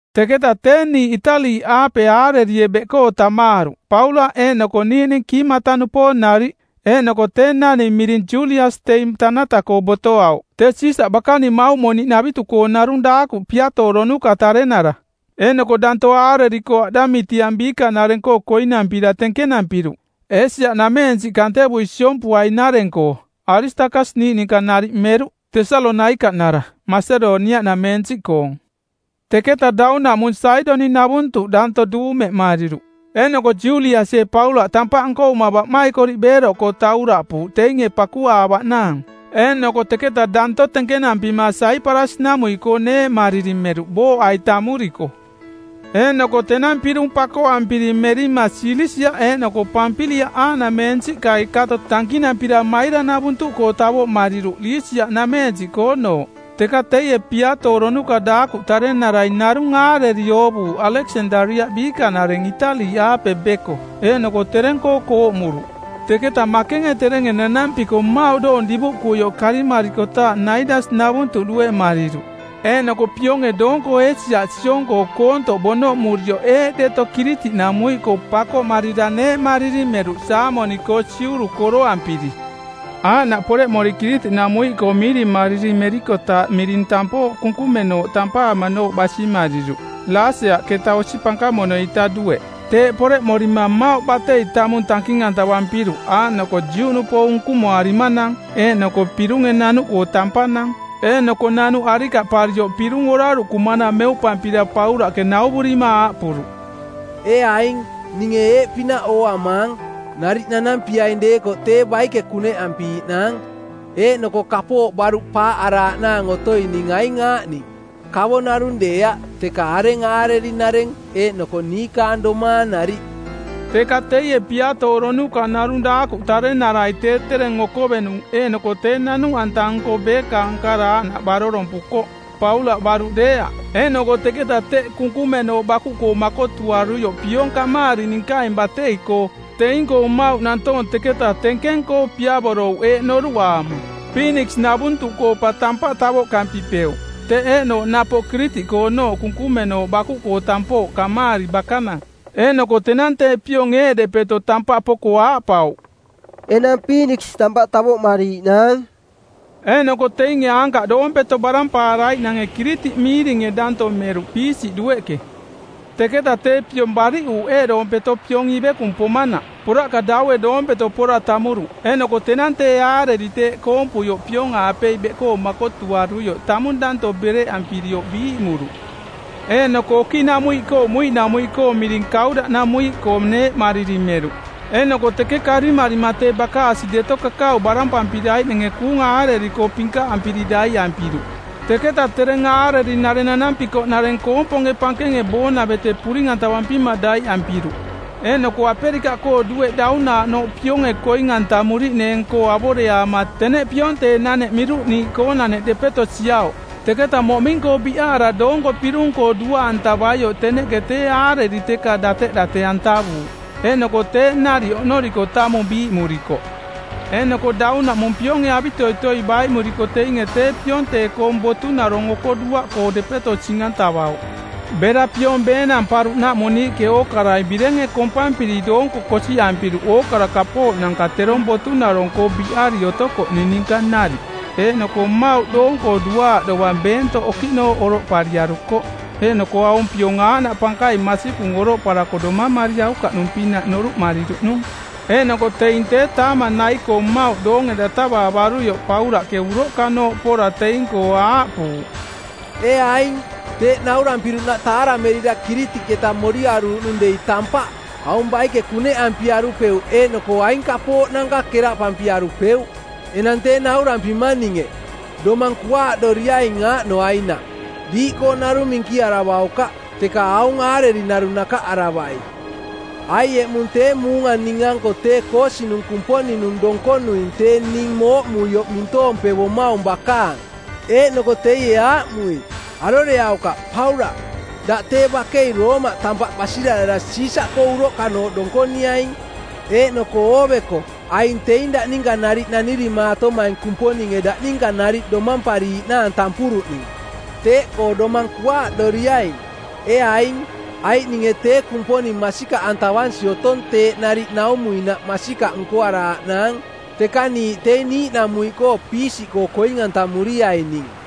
Teketa tee niiꞌ Itali-aape aarerie beꞌkoo tamaaruꞌ Paulaꞌ eeꞌnoko niiꞌning kiimata-nupoong nariꞌ. Eeꞌnoko tee naning miring Julias teing tanata-koo botoauꞌ, tee Siisaꞌ bakaning mauꞌmoniꞌnavitu-koo narung daakuꞌ piatooronuka tarenara. Eeꞌnoko danto aareri-koo Aꞌdamitiang biikanareng-koo koinampira tenkenampiruꞌ, Eesia-nameensiꞌ kantevui siompuai-nareng-koo. Aristakas niiꞌ ninka nariꞌ meruꞌ, Tesalonaikaꞌnara, Masedoniaꞌnameensiꞌkoong. Teketa daunaꞌmung Saidoniꞌnavuntuꞌ daanto duumemariruꞌ, eeꞌnoko Juliasie Paulaꞌ tampaꞌ nkovuma baꞌmaikoriꞌ beeroꞌkoo tauraꞌpuuꞌ teinge pakuaavaꞌnaang. Eeꞌnoko teketa danto tenkenampima Saiparasi-namuiꞌkoo neeꞌmariri meruꞌ booꞌai tamuriko. Eeꞌnoko tenang pirung pakoꞌampiri merima Silisia eeꞌnoko Pampiliaꞌ aaꞌnamensiꞌkai kato tankinampira Maira-navuntuꞌkoo tavoꞌmariruꞌ Lisia-nameensiꞌkoonooꞌ. Teka teie piatooronuka daakuꞌ tarenarai narung aareri oovuuꞌ Aleksandariaꞌ biikanareng Itali-aape beko, eeꞌnoko tereng-koo kooꞌmuruꞌ. Teketa makenge terenge nanampiko mmauꞌ doong divuꞌkuioꞌ karimarikotaaꞌ Naidas-navuntuꞌ dueꞌmariruꞌ. Eeꞌnoko pionge doonko Eesia siong-koo koontoꞌ bonoꞌmurioꞌ eeꞌ deto Kiritiꞌnamuiꞌkoo pakoꞌmarira neeꞌmariri meruꞌ Saamoni-koo siuru˜ koroampiri. Aaꞌnaꞌ poreꞌmori Kiritiꞌnamuiꞌkoo miirimariri merikotaaꞌ niiꞌnooꞌ miring Tampooꞌ Kunkumenooꞌ tampaamanooꞌ basimariruꞌ, Laseaꞌketa osi pankamono-ita dueꞌ. Teeꞌ poreꞌmorima mmauꞌ batei tamung tanking-antavampiruꞌ aaꞌnoko Juꞌnupoong unkumoarimanang eeꞌnoko pirunge nanuꞌkoo tampanang. Eeꞌnoko nanuꞌ arikaꞌparioꞌ pirung oraruꞌkumanang meuꞌpampira Paulaꞌke nauvurima aaꞌpuruꞌ, “Ee aing, ninge eeꞌpinaꞌ ooamaang: Nariꞌ nanampiaing deekoꞌ tee baike kuneꞌampiiꞌnaang, eeꞌnoko kapooꞌ baruꞌ paaꞌaraaꞌnaang otoining aing aaꞌning: kavo narung deeaꞌ teka areng aareri-nareng eeꞌnoko niikaang domaang nariꞌ.” Teka teie piatooronuka narung daakuꞌ tarenarai tee tereng okovenung eeꞌnoko tee nanuꞌanta-nko beekaang kara aaꞌnaꞌ barorompukoꞌ, Paulaꞌ baruꞌ deeaꞌ. Eeꞌnoko teketa teꞌ kunkumenooꞌ bakuꞌkoo makotuaruioꞌ piong kamaari ninkaing batei-koo, teing-koo mmauꞌ nantoong teketa tenkeng-koo piavorouꞌ eeꞌ noruꞌaama, Piiniks-navuntuꞌkoo pa tampaꞌ tavoꞌkampipeuꞌ. Teꞌ eeꞌnooꞌ napoꞌ Kiritiꞌkoonooꞌ kunkumenooꞌ bakuꞌkoo tampooꞌ kamaari bakanang. Eeꞌnoko tenang tee piong eeꞌdepeto tampaꞌ poko aaꞌpauꞌ, “Enang Piiniks tampaꞌ tavoꞌmariiꞌnaang.” Eeꞌnoko teinge aankaꞌ doompeto barampaaraiꞌnange Kiritiꞌ miiringe danto meruꞌ piisiꞌ dueꞌke. Teketa tee piong bariꞌuuꞌ eeꞌdoompeto piong ivekung pomanaꞌ, poraꞌka daue doompeto pora tamuruꞌ. Eeꞌnoko tenang tee aareri teeꞌ kompuioꞌ piong-aapei beꞌkoo makotuaruioꞌ tamung danto bereꞌampirioꞌ biiꞌmuruꞌ. Eeꞌnoko okiꞌnamuiꞌkoo muiꞌnamuiꞌ miring Kaudaꞌnamuiꞌkoo neeꞌmariri meruꞌ, eeꞌnoko teke karimarima tee bakaasi deto kakau barampampiraiꞌnange kuunga aareri-koo pinkaꞌampiri daiꞌampiruꞌ. Teketa tereng aareri-nareng nanampi-koꞌnareng koomponge pankenge boonavete puring-antavampima daiꞌampiruꞌ. Eeꞌnoko Aperikaꞌkoo dueꞌ daunaaꞌnooꞌ pionge koing-antamuriꞌneeng-koo avoreaama teneꞌ pionteeꞌnaneꞌ miiruni-koonaneꞌ depeto siauꞌ. Teketa moꞌming-koo biꞌaara doonko pirung-koo duaꞌantavaioꞌ teneꞌke tee aareri teka dateꞌdate-antavuuꞌ. Eeꞌnoko teeꞌ nariꞌ oꞌnoriko tamung biiꞌmurikoꞌ. Eeꞌnoko daunaꞌmung pionge avitoitoi baiꞌmuriko teinge tee pionteeꞌkoong botunarong oko duaꞌkoo depeto sing-antavauꞌ. Bera piong beenamparuꞌnaꞌmung niiꞌke ookarai birenge kompampiri doonko kosiꞌampiruꞌ ookara kapooꞌnanka terong botunarong-koo biꞌari otokoꞌning ninka nariꞌ. Eeꞌnoko mmauꞌ doong-koo duaaꞌ dovang beentoꞌ okiꞌnooꞌ oroꞌpariarukoꞌ, eeꞌnoko aung piong aaꞌnaꞌ pankaing masikung oroꞌparako domamariaukaꞌnung-pinaꞌ noruꞌmariruꞌnung. Eeꞌnoko teing tee taamang nai-koo mmauꞌ doonge datavaavaruioꞌ Paulaꞌke uroꞌkanooꞌ pora teing-koo aaꞌpuuꞌ, “Ee aing, teeꞌ naurampiruꞌnaꞌ taaramerira Kiritiꞌketa moriaruuꞌnung dei tampaꞌ, aung baike kuneꞌampiarupeuꞌ eeꞌnoko aing kapooꞌnanka keraꞌpampiarupeuꞌ. Enang tee naurampimang ninge, domang kuaaꞌdoriaing aaꞌnoainaꞌ: diiꞌkoo narung minkiaravaukaꞌ, teka aung aareri narung nakaꞌaravai. Aiꞌ eꞌmung tee muunga ning-anko tee koosinung˜ Kumponing-nung donkonuing tee ning mooꞌmuioꞌ mintoompevomaung bakaang. Eeꞌnoko teie aaꞌmui, ‘Aroreaukaꞌ, Paulaꞌ. Daꞌ tee bakei Roomaꞌ tampaꞌ basirarara Siisaꞌkoo uroꞌkanooꞌ donkoniaing. Eeꞌnoko ooveko aing teing daꞌ ninka nariꞌ nanirimaatomaing Kumponinge daꞌ ninka nariꞌ domampariiꞌnaang tampuruꞌning.’ Teeꞌkoo domang kuaaꞌdoriaing, ee aing, aiꞌ ninge tee Kumponing masikaꞌantavansi otong teeꞌ nariꞌ naumuinaꞌ masikaꞌ nkoaraaꞌnaang. Teka niiꞌ teing niiꞌnamuiꞌkoo piisiꞌkoo koing-antamuriaining.”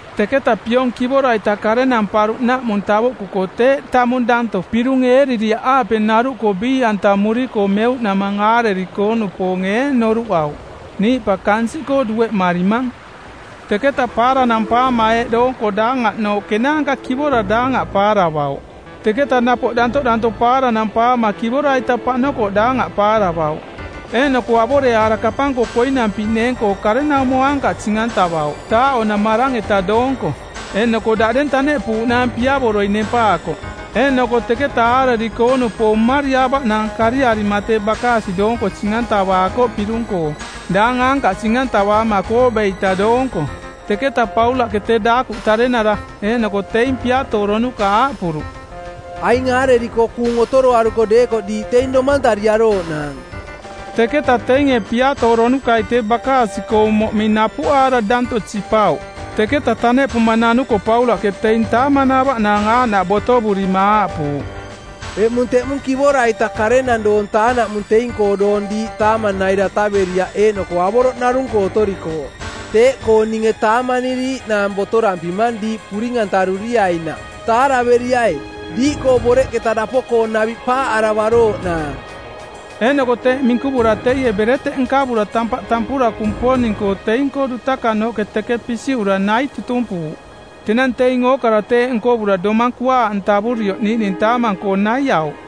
Teketa piong kivora-ita karenamparuꞌnaꞌmung tavoꞌkuko teeꞌ tamung danto pirung Eeriria-aape-naruꞌkoo biiꞌantamuriko meuꞌnamang aareri-koo-nupoonge eeꞌ noruꞌauꞌ: Niiꞌ pa kansiꞌkoo dueꞌmarimang. Teketa paaranampaama eeꞌ doonko daangaꞌnooꞌ kenaanka kivora daangaꞌ paaravauꞌ. Teketa napoꞌ dantoꞌdaanto paarananpaama kivora-ita paꞌnokoꞌ daangaꞌ paaravauꞌ. Eeꞌnoko avoreaara kapang-koo koinampiꞌneeng-koo karenaumo aankaꞌ sing-ntavauꞌ taaꞌo˜namarang-eta doonko. Eeꞌnoko daꞌdeng taneꞌpuuꞌnaang piavoroi nempaakoꞌ. Eeꞌnoko teketa aareri-koo-nupoong mmariaavaꞌnaang kariarima tee bakaasi doonko sing-antavaakoꞌ pirung-koo, daang aankaꞌ sing-antavaama kooꞌbe˜ita doonko. Teketa Paulaꞌke tee daakuꞌ tarenara eeꞌnoko teing piatooronuka aaꞌpuruꞌ, “Aing aareri-koo kuung otoroaruko deekoꞌ diiꞌ teing domantariarooꞌnaang.” Teketa teinge piatooronukai tee bakaasi-koong moꞌming napuꞌaara danto sipauꞌ. Teketa taneꞌpuma nanuko Paulaꞌke teing taamanaavaꞌnaang aaꞌnaꞌ botovurima aaꞌpuuꞌ, “Eꞌmung teꞌmung kivora-ita ˜karenang doong taa-naꞌmung teing-koo doong diiꞌ taamang nai dataveriaꞌ eeꞌnoko avoroꞌ narung-koo otorikooꞌ. Teeꞌkoo ninge taamaniriiꞌnaang botorampimang diiꞌ puring-antaruriainaꞌ. Taaraveriai, diiꞌkoo boreꞌketa dapo-koo naviꞌ paaꞌaravarooꞌnaang.” Eeꞌnoko teeꞌ minkuvura teie bereteꞌ nkavura tampaꞌ tampura Kumponing-koo, teing-koo dutakanooꞌke teke pisiꞌura nai tutumpuuꞌ. Tenang teing ookara teeꞌ nkovura domang kuaaꞌantavurioꞌ niiꞌning taamang-koo naiauꞌ.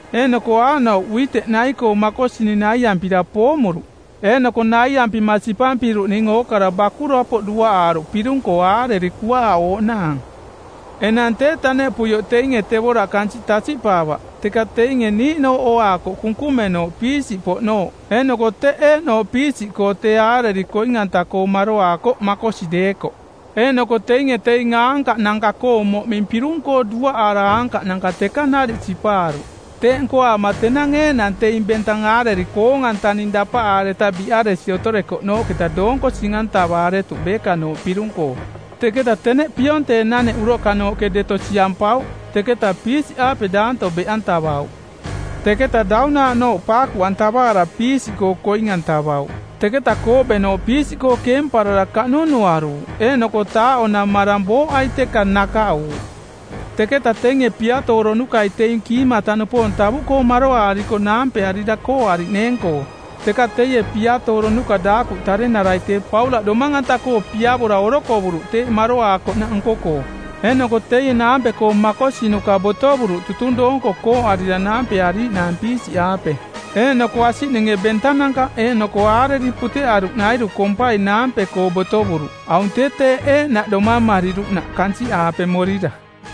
Eeꞌnoko aaꞌnouꞌ uiteꞌ nai-koo makosining naiampira poomuruꞌ, eeꞌnoko naiampima sipampiruꞌning ookara bakurapoꞌ duaꞌaaruꞌ pirung-koo aareri kuaaꞌooꞌnaang. Enang tee taneꞌpuioꞌ teinge tevoraꞌ kansiꞌ tasiꞌpaavaꞌ, teka teinge niiꞌnooꞌ ooaakoꞌ kunkumenooꞌ piisiꞌpoꞌnooꞌ eeꞌnoko teꞌ eeꞌnooꞌ piisiꞌkoo tee aareri koing-anta-koo maroaakoꞌ makosi deekoꞌ. Eeꞌnoko teinge teing aankaꞌnanka-koong moꞌming pirung-koo duaꞌaara aankaꞌnanka teka nariꞌ sipaaruꞌ. Teeꞌ nkoaama tenang eeꞌnang teing bentang aareri koong-antaning dapaꞌaareta biꞌaresi otorekoꞌnooꞌketa doonko sing-antavaaretuꞌ beekanooꞌ pirung-koo. Teketa teneꞌ pionteeꞌnaneꞌ uroꞌkanooꞌnaneꞌ deto siampauꞌ, teketa piisiꞌaape daanto beꞌantavauꞌ. Teketaꞌ daunaaꞌnooꞌ paakuꞌantavaara piisiꞌkoo koing-antavauꞌ. Teketa kooꞌbenooꞌ piisiꞌkoo keemparara kaꞌnunuaruuꞌ eeꞌnoko taaꞌo-namarang booꞌai teka nakaꞌuuꞌ. Teketa teinge piatooronukai teing kiimata-nupoong tavuꞌkoo maroaarikoꞌ naampearira kooꞌariꞌneeng-koo. Teka teie piatooronuka daakuꞌ tarenarai tee Paulaꞌ domang-anta-koo piavora orokovuruꞌ teeꞌ maroaakoꞌnaꞌ nko-koo. Eeꞌnoko teie naampe-koo makosinuka botovuruꞌ tutung doonko kooꞌarira naampeariiꞌnaang piisiꞌaape. Eeꞌnoko asiꞌninge bentananka eeꞌnoko aareri puteꞌaruꞌnairu kompai naampe-koo botovuruꞌ. Aung tee teeꞌ eeꞌnaꞌ domamariruꞌnaꞌ kansiꞌaape morira.